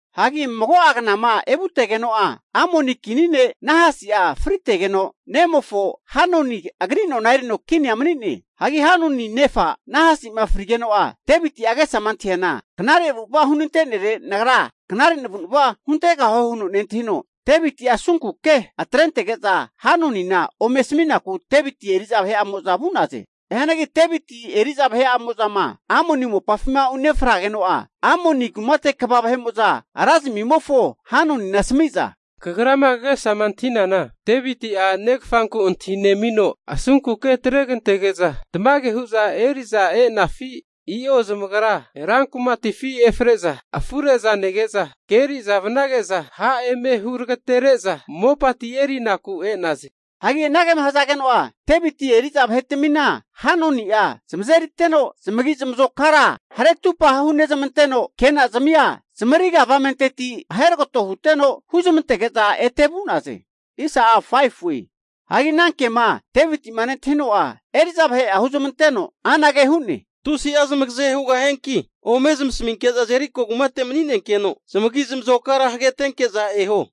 Hagi mago'a knama evutegeno'a Amoni kini ne' Nahasi'a fritegeno, nemofo Hanuni agri nona erino kinia mani'ne. Hagi Hanuni nefa Nahasi'ma frigeno'a Deviti'a agesama antahiana, knare avu'ava hunante'nere, nagra knare navu'nava huntegahue huno nentahino, Deviti'a asunku ke atrentege'za Hanunina ome asami'naku Deviti eri'za vahe'amo'za vu'naze. Hianagi Deviti eri'za vahe'mo'zama Amoni mopafima unefrageno'a, Amoni kumate kva vahe'mo'za ra zamimofo Hanunina asami'za, Kagrama kagesama antahinana Devitia negafanku antahinemino asunku ke atregantege'za tamage hu'za eri'za e'nafi? I'o zamagra rankumatifi efre'za afure'za nege'za, ke eri'za vanage'za, ha' eme huragatere'za mopati erinaku e'naze. Hagi anagema hazageno'a Deviti eri'za vahetamina Hanuni'a zamazeriteno, zamagi zamazokara hare atupa hunezamanteno, kenazamia zamariga avamenteti aheragato huteno, huzmantege'za ete vu'naze. Hagi ana kema Deviti'ma nentahino'a, eri'za vahe'a huzmanteno anage hu'ne, Tusi'a zamagaze hugahianki ome zamasaminke'za Jeriko mani'nenkeno zamagi zamazokara hagetenke'za eho.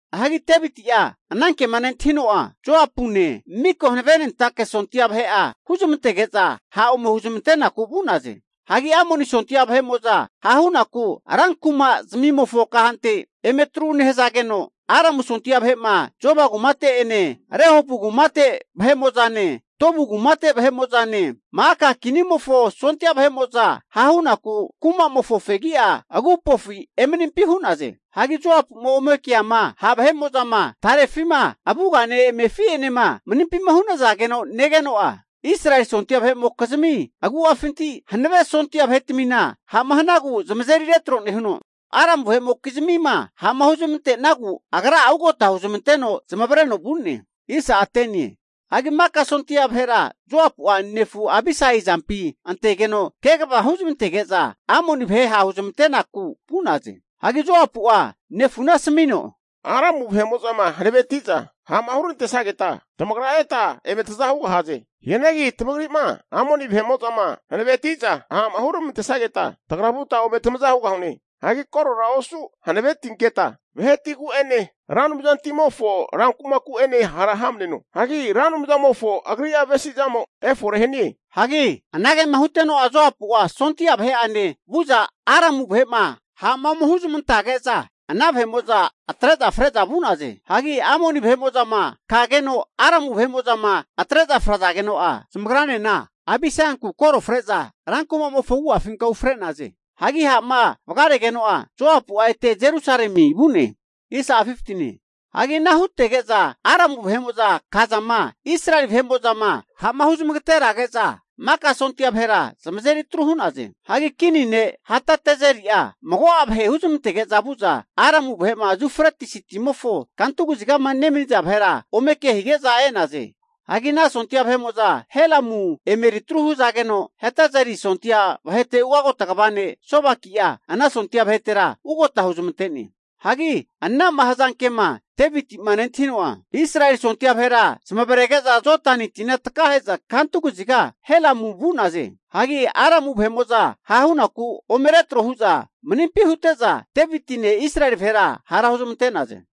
Hagi Deviti'a anankema nentahino'a Joapune, mika hanavenentake sondia vahe'a huzamantege'za ha' ome huzamantenaku vu'naze. Hagi Amoni sondia vahe'mo'za ha' hunaku ranku'ma zamimofo kahante emeri atru nehazageno, Aramu sondia vahe'ma Zoba kumate'ene, Rehobu kumate vahe'mo'zane, Tob kumate ne, Ma'aka kinimofo sondia vahe'mo'za ha' hunaku kuma'mofo fegi'a agupofi emanimpi hu'naze. Hagi Joapuma ome keama ha' vahe'mo'zama tarefima avugane amefi'enema manimpima hunazageno negeno'a, Israeli sondia vahe'mokizmi agu'afinti hanave sondia vahetamina ha'ma hanagu zamazeri retro nehuno, Aramu vahe'moki'zmima ha'ma huzmante'nagu agra'a ugota huzmanteno zamavareno vu'ne. Hagi maka sondia vahera Joapu'a nefu Abisai azampi antegeno, kegava huzamantege'za Amoni vahe ha' huzamantenaku vu'naze. Hagi Joapu'a nefuna asamino, Aramu vahe'mo'zama hanaveti'za ha'ma hurantesageta, tamagra eta eme taza hugahaze. Hianagi tamagri'ma Amoni vahe'mo'zama hanaveti'za ha'ma huramantesageta, tagra vuta ome tamaza hugahune. Hagi korora osu hanavetinketa vahetigu'ene Ra Anumzantimofo rankumaku'ene hara hamneno. Hagi Ra Anumzamofo agri'a avesizamo efore hanie. Hagi anagema huteno'a Joapu'a sondia vahe'ane vu'za Aramu vahe'ma ha'ma ome huzmantage'za ana vahe'mo'za atre'za fre'za vu'naze. Hagi Amoni vahe'mo'zama kageno, Aramu vahe'mo'zama atre'za frazageno'a, zamagranena Abisaianku koro fre'za rankuma'mofo agu'afinka ufre'naze. Hagi ha'ma vagaregeno'a, Joapu'a ete Jerusalemi vu'ne. Hagi ana hutege'za Aramu vahe'mo'za kazama, Israeli vahe'mo'zama ha'ma huzmagaterazage'za maka sondia vahera zamazeri atru hu'naze. Hagi kini ne' Hadadezeri'a mago'a vahe huzmantege'za vu'za, Aramu vahe'ma Yufretisi timofo kantu kazigama nemaniza vahera ome ke hige'za e'naze. Hagi ana sondia vahe'mo'za Helamu emeri atru hazageno, Hadadezeri sondia vahete ugota kva ne' Sobaki'a ana sondia vahetera ugagota huzmante'ne. Hagi ana'ma hazanke'ma Deviti'ma nentahino'a Israeli sondia vahera zamavarege'za Jodani tina takahe'za kantu kaziga Helamu vu'naze. Hagi Aramu vahe'mo'za ha' hunaku ome retro hu'za manimpi hute'za, Devitine Israeli vahera hara huzmante'naze.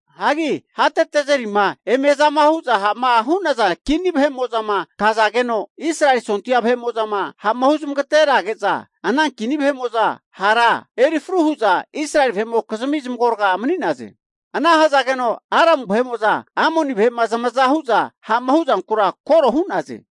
Hagi Hadadezerima eme azama hu'za ha'ma hu'naza kini vahe'mo'zama kazageno, Israeli sondia vahe'mo'zama ha'ma huzmageterage'za, ana kini vahe'mo'za hara erifru hu'za Israeli vahe'mokizmi zamagorga mani'naze. Ana hazageno Aramu vahe'mo'za Amoni vahe'ma zamaza hu'za ha'ma huzankura koro hu'naze.